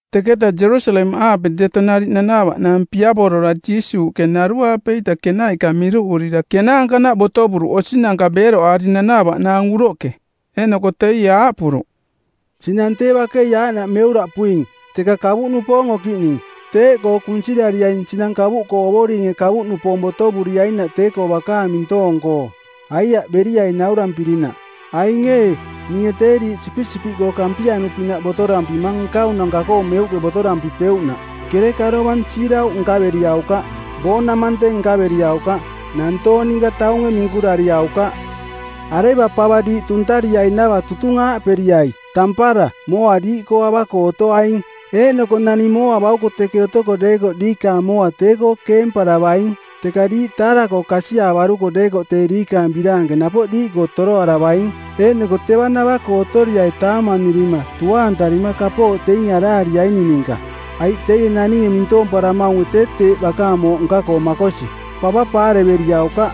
Teketa Jerusalemaꞌaape deto nariꞌ nanaavaꞌnaang piavora Jiisuuꞌke naruaape-ita kenaiꞌka miruꞌurira kenaankanaꞌ botovuruꞌ osinanka beeroꞌaari nanaavaꞌnaang uroꞌke. Eeꞌnoko teie aaꞌpuruꞌ, “Sinang tee bakei aaꞌnaꞌ meuraꞌpuing, teka kavuꞌnupoong okiꞌning, teeꞌkoo kunsirariaing sinang kavuꞌkoo Ovoringe kavuꞌnupoong botovuriainaꞌ tee-koo bakaang mintoong-koo. Aiaꞌ beriai naurampirinaꞌ. Aing ee, ninge tee diiꞌ sipisipiꞌkoo kampianu-pinaꞌ botorampimang nkaunanka-koo meuꞌke botorampipeuꞌnaꞌ. Kereka dovang siirauꞌ nkaveriaukaꞌ, boonamante˜ nkaveriaukaꞌ. Nantoong ninka taunge minkurariaukaꞌ. “Areva pava diiꞌ tuntariainava tutung aaꞌperiai: Tampara! Mooa diiꞌkoo ava-koo otoaing. Eeꞌnoko naning mooa bauko teke otoko deekoꞌ diikaang mooa tee-koo keemparavaing. Teka diiꞌ taara-koo kasiaavaruko deekoꞌ tee diikaang biraanke napoꞌ diiꞌkoo toroaravaing. Eeꞌnoko teva nava-koo otoriai taamanirima tuaantarima kapooꞌ teinge araariaining ninka, aiꞌ teie naninge mintoomparamaunge tee teeꞌ bakaang mooꞌ nka-koo makosi. Pava paareveriaukaꞌ.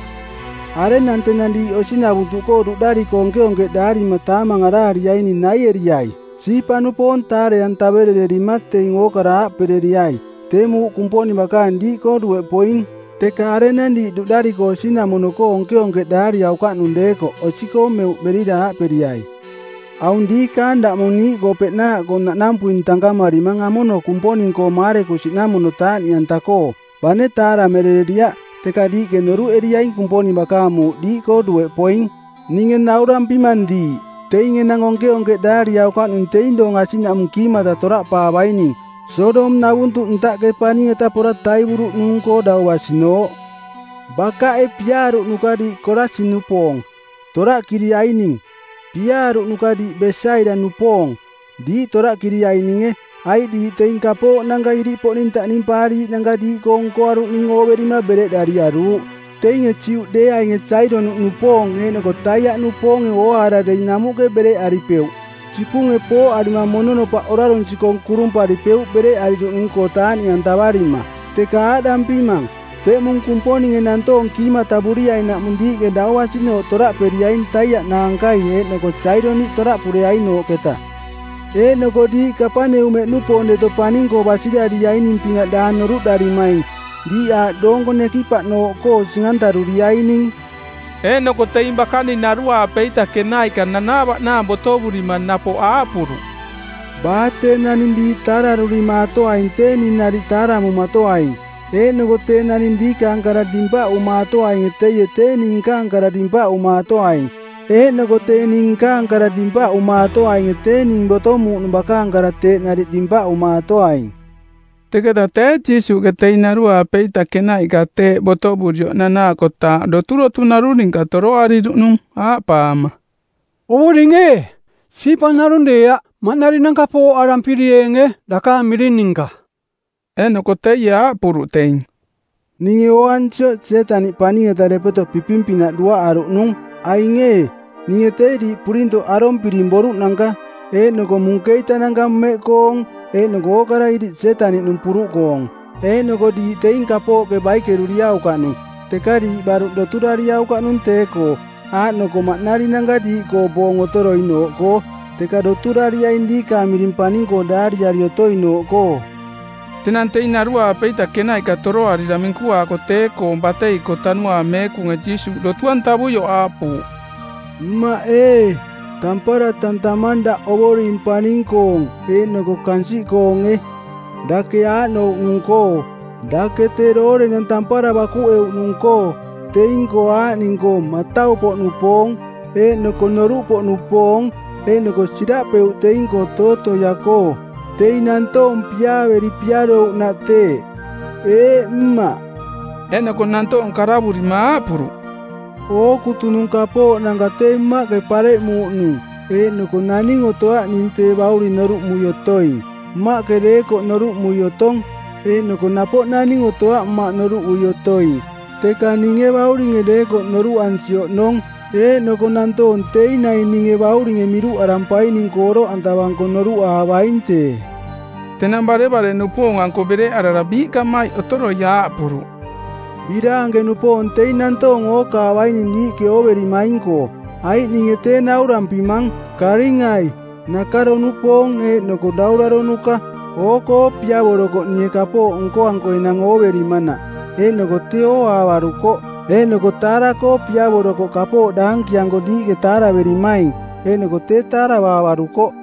“Arenang tenang diiꞌ osi navuntuꞌkoo duꞌdariko onkeonkeꞌdaarima taamang araariaing naieriai. Siipa-nupoong taare-antaverererima teing ookara aaꞌpereriai, ‘Tee muuꞌ Kumponing Bakaang diiꞌkoo dueꞌ poing.’ “Teka arenang diiꞌ duꞌdariko osinamono-koo onkeonkeꞌdaariaukaꞌnung deekoꞌ osi-koo meuꞌ berira aaꞌperiai, ‘Aung diikaang daꞌmong niiꞌkoo peꞌnaaꞌkoo naꞌnampuing tankamarimang amono Kumponing-koo maarekusiꞌnamono taaꞌniꞌanta-koo. Bane taaramerereriaꞌ teka diiꞌke noruꞌeriaing Kumponing bakaang muuꞌ diiꞌkoo dueꞌ poing.’ Ninge naurampimang diiꞌ, teing enang onkeonkeꞌdaariaukaꞌning teing doong asiꞌnaꞌmung kiimata toraꞌpaavaining, Sodom-navuntuꞌ ntaꞌke paning-eta pora taivuruꞌnung-koo dau basinooꞌ.” “Bakaꞌe piaaruꞌnuka diiꞌ Korasin-nupoong, toraꞌkiriaining. Piaaruꞌnuka diiꞌ Besaida-nupoong, diiꞌ toraꞌkiriaininge, aiꞌ diiꞌ teing kapooꞌnanka iriꞌpoꞌning taꞌnimpaariiꞌnanka diiꞌkoo nkoaruꞌning ooverima bereꞌdariaruuꞌ. Teinge Juꞌdeeaing Saidoniꞌnupoong eeꞌnoko Taiaꞌnupoonge ooaara dei namuꞌke bereꞌaripeuꞌ, sipunge pooꞌarima mononopaꞌ orarunsi-koong kurumparipeuꞌ bereꞌariruꞌnung-koo taaꞌniꞌantavarima. Teka aaꞌdampimang, teꞌmung Kumponinge nantoong kiimatavuriainaꞌmung diiꞌke dau basinooꞌ toraꞌperiaing Taiaꞌ naankai eeꞌnoko Saidoniꞌ toraꞌpureainooꞌketa. Eeꞌnoko diiꞌ Kapaneumeꞌnupoong deto paning-koo basirariaining-pinaꞌ daang noruꞌdarimaing. Diiꞌ aaꞌ doonko nekipaꞌnooꞌkoo sing-antaruriaining.” Eeꞌnoko teing bakaning naruaape-ita kenaiꞌka nanaavaꞌnaang botovurima napoꞌ aaꞌpuruꞌ, “Baa tee naning diiꞌ taararurimaatoainge tee ning nariꞌ taaramumatoaing. Eeꞌnoko tee naning diikaang kara dimpaꞌumaatoainge teie tee ning nkaang kara dimpaꞌumaatoaing. Eeꞌnoko tee ning nkaang kara dimpaꞌumaatoainge tee ning botomuuꞌnung bakaang kara teeꞌ nariꞌ dimpaꞌumaatoaing.” Teketa tee Jiisuuꞌke teing naruaape-ita kenaiꞌka tee botovurioꞌ nanaakotaaꞌ doturotu narung ninka toroariruꞌnung aaꞌpaama, “Ovoring ee, siipa narung deeaꞌ maꞌnarinanka apooꞌarampirieenge dakaang miring ninka.” Eeꞌnoko teie aaꞌpuruꞌ teing, “Ninge ooansioꞌ Sietaniꞌ paning-eta depeto piping-pinaꞌ duaꞌaruꞌnung. Aing ee, ninge tee diiꞌ purintoꞌ arompiring boruꞌnanka eeꞌnoko munkeitananka mmeꞌkoong eeꞌnoko ookara iriꞌ Sietaniꞌnung puruꞌkoong, eeꞌnoko diiꞌ teing kapooꞌke baikeruriaukaꞌnung. Teka tee diiꞌ baruꞌ doturariaukaꞌnung tee-koo, aaꞌnoko maꞌnarinanka diiꞌkoo boong otoroinooꞌkoo, teka doturariaing diikaang miring paning-koo daariari otoinooꞌkoo.” Tenang teing naruaape-ita kenaiꞌka toroarira minkuaako tee-koo batei-koo Tanuaang Meekunge Jiisuuꞌ dotu-antavuioꞌ aaꞌpuuꞌ, “Mmaꞌ ee, tampara tantamang daꞌ Ovoring paning-koong eeꞌnoko kansiꞌkoonge, Dake aaꞌnouꞌnung-koo: Dake tee doorenang tampara bakuꞌeuꞌnung-koo teing-koo aaꞌning-koo matau-poꞌnupoong eeꞌnoko noruꞌpoꞌnupoong eeꞌnoko siraꞌpeuꞌ teing-koo tootoia-koo. Teing nantoong piaaveri piarouꞌnaꞌ teeꞌ. Eeꞌ, Mmaꞌ.” Eeꞌnoko nantoong karavurima aaꞌpuruꞌ, “Ookutunung kapooꞌnanka tee Mmaꞌke pareꞌmuuꞌnung eeꞌnoko naning otoaꞌ ning Tee Bauring noruꞌmui otoing, Mmaꞌke deekoꞌ noruꞌmui otong. Eeꞌnoko napoꞌ naning otoaꞌ Mmaꞌ noruꞌui otoing, teka ninge Bauringe deekoꞌ noruꞌansi oꞌnong. Eeꞌnoko nantoong teing naing ninge Bauringe miruꞌarampaining-koo oroꞌantavanko noruꞌaavaing tee.” Tenang barevare-nupoong-anko bereꞌarara biiꞌkamaiꞌ otoroi aaꞌpuruꞌ, “Biraanke-nupoong teing nantoong ookaavaining diiꞌke ooverimaing-koo. Aiꞌ ninge tee naurampimang, karingai-nakaro-nupoong eeꞌnoko dauraronuka-oo-koo piavorokoꞌ ninge kapooꞌ nkoanko enang ooverimanaꞌ, eeꞌnoko tee ooaavarukoꞌ. Eeꞌnoko taara-koo piavorokoꞌ kapooꞌ daankianko diiꞌke taaraverimaing, eeꞌnoko tee taaravaavarukoꞌ.”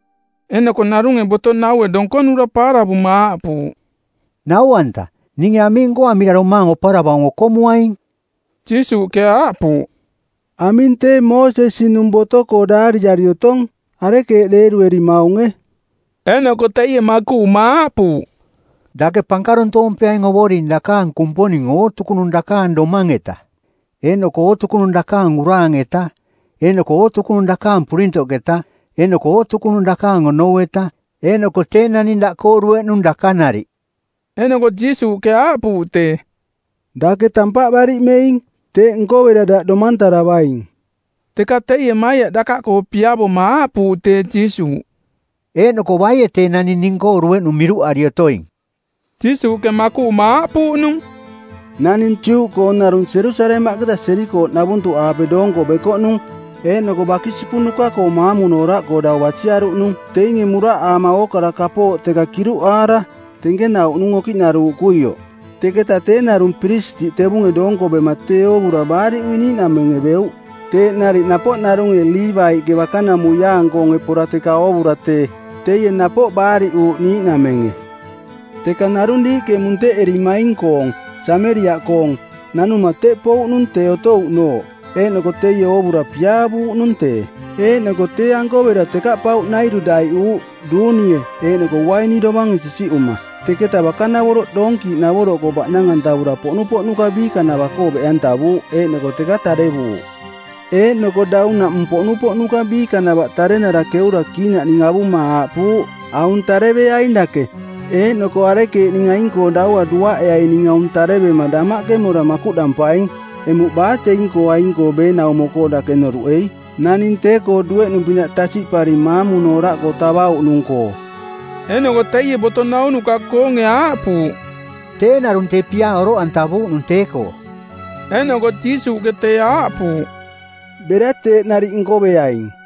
Eeꞌnoko narunge boto-naue donkonura paaravuma aaꞌpuuꞌ, “Nau-anta, ninge aming nkoamira domaang oparavaung okomuaing?” Jiisuuꞌke aaꞌpuuꞌ, “Aming tee Moosesi-nung boto-koo daariari otong? Arekeeꞌ deeruemaunge?” Eeꞌnoko teie makuꞌuma aaꞌpuuꞌ, “Dake pankaruntoompeaing Ovoring dakaang Kumponing ootukunung dakaang domang-eta eeꞌnoko ootukunung dakaang uraang˜eta eeꞌnoko ootukunung dakaang purintoꞌketa eeꞌnoko ootukunung dakaang onou-eta, eeꞌnoko tee naning daꞌkoo dueꞌnung daka nariꞌ.” Eeꞌnoko Jiisuuꞌke aaꞌpuuꞌ tee, “Dake tampaꞌ bariꞌmeing. Teeꞌ nkovera daꞌ domantaravaing.” Teka teie maiaꞌ dakaꞌkoo piavoma aaꞌpuuꞌ tee Jiisuuꞌ, “Eeꞌnoko baie tee naning ning-koo dueꞌnung miruꞌari otoing?” Jiisuuꞌke makuꞌuma aaꞌpuuꞌnung, “Naning Juꞌkoo narung Jerusalemaꞌketa Jerikooꞌnavuntuꞌaape doonko bekoꞌnung eeꞌnoko bakisipunuka-koo maamunooraꞌkoo dau basiaruꞌnung. Teinge muraꞌaama ookara kapooꞌ teka kiruꞌaara tenkenauꞌnung okiꞌnaruuꞌkuioꞌ. Teketa tee narung piristiꞌ tevunge doonko bema tee oovura baariꞌui niiꞌnamenge beuꞌ. Teeꞌ nariꞌ napoꞌ narunge Liivaiꞌke bakanamuiaang-koonge pora teka oovura tee, teie napoꞌ baariꞌuuꞌ niiꞌnamenge. “Teka narung diiꞌke munteꞌererimaing-koong, Sameriaꞌkoong, nanuma teꞌ pouꞌnung tee otouꞌnooꞌ, eeꞌnoko teie oovura piaavuuꞌnung tee. Eeꞌnoko tee-anko bera tekaꞌpauꞌnairu daiꞌuuꞌ, duunie eeꞌnoko uaini dovange sisiꞌuma, teketa bakanavoroꞌ doonkiiꞌnavoroꞌkoo baꞌnang-antavura poꞌnupoꞌnuka biikanava-koo beꞌantavuuꞌ eeꞌnoko teka tarevuuꞌ. Eeꞌnoko daunaꞌmung poꞌnupoꞌnuka biikanavaꞌ tarenara keura kiinaꞌning avuma aaꞌpuuꞌ, ‘Aung tareveaing dake, eeꞌnoko arekeeꞌning aing-koo daua duaꞌeaining aung tarevema damaꞌke mora makuꞌdampaing.’ Emuꞌ baa teing-koo aing-koo beenaumo-koo dake noruꞌei, naning tee-koo dueꞌnung-pinaꞌ tasiꞌparing maamunooraꞌkoo tavauꞌnung-koo?” Eeꞌnoko teie boto naunuka-koonge aaꞌpuuꞌ, “Tee narung tee piaa oroꞌantavuuꞌnung tee-koo.” Eeꞌnoko Jiisuuꞌke tee aaꞌpuuꞌ, “Bera teeꞌ nariꞌ nkoveaing.”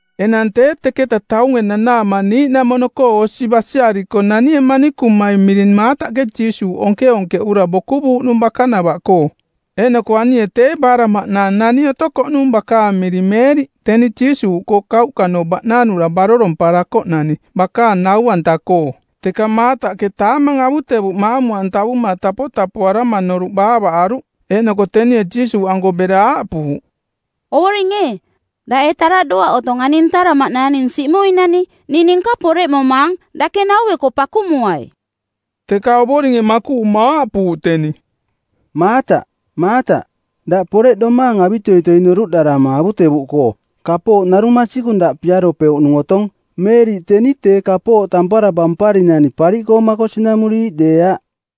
Enang tee teketa taunge nanaama niiꞌnamono-koo osi basiariko nanie manikumai miring Maataꞌke Jiisuuꞌ onkeonkeꞌura bokuvuuꞌnung bakanava-koo. Eeꞌnoko anie tee baaraꞌmaꞌnaang nani otokoꞌnung bakaang miring Meeriꞌ, teni Jiisuuꞌkoo kauꞌkanooꞌ baꞌnanura baroromparakoꞌnani bakaang nau-anta-koo. Teka Maataꞌke taamang avutevuꞌ maamu-antavuma tapotapoarama noruꞌ baavaꞌaruꞌ, eeꞌnoko tenie Jiisuuꞌanko bera aaꞌpuuꞌ, “Ovoring ee, daꞌ ee taraꞌdoaꞌ otong ani ntaraꞌmaꞌnaang ning siꞌmuinani? Ning ninka poreꞌmomaang. Dake naueko pakumuai.” Teka Ovoringe makuꞌuma aaꞌpuuꞌ teni, “Maataꞌ, Maataꞌ, daꞌ poreꞌdomaang avitoitoi noruꞌdarama avutevuꞌkoo. Kapooꞌ narung masikung daꞌ piaropeuꞌnung otong. Meeriꞌ teni tee kapooꞌ tampara bamparinani pariꞌkoo makosinamuriiꞌ deeaꞌ.”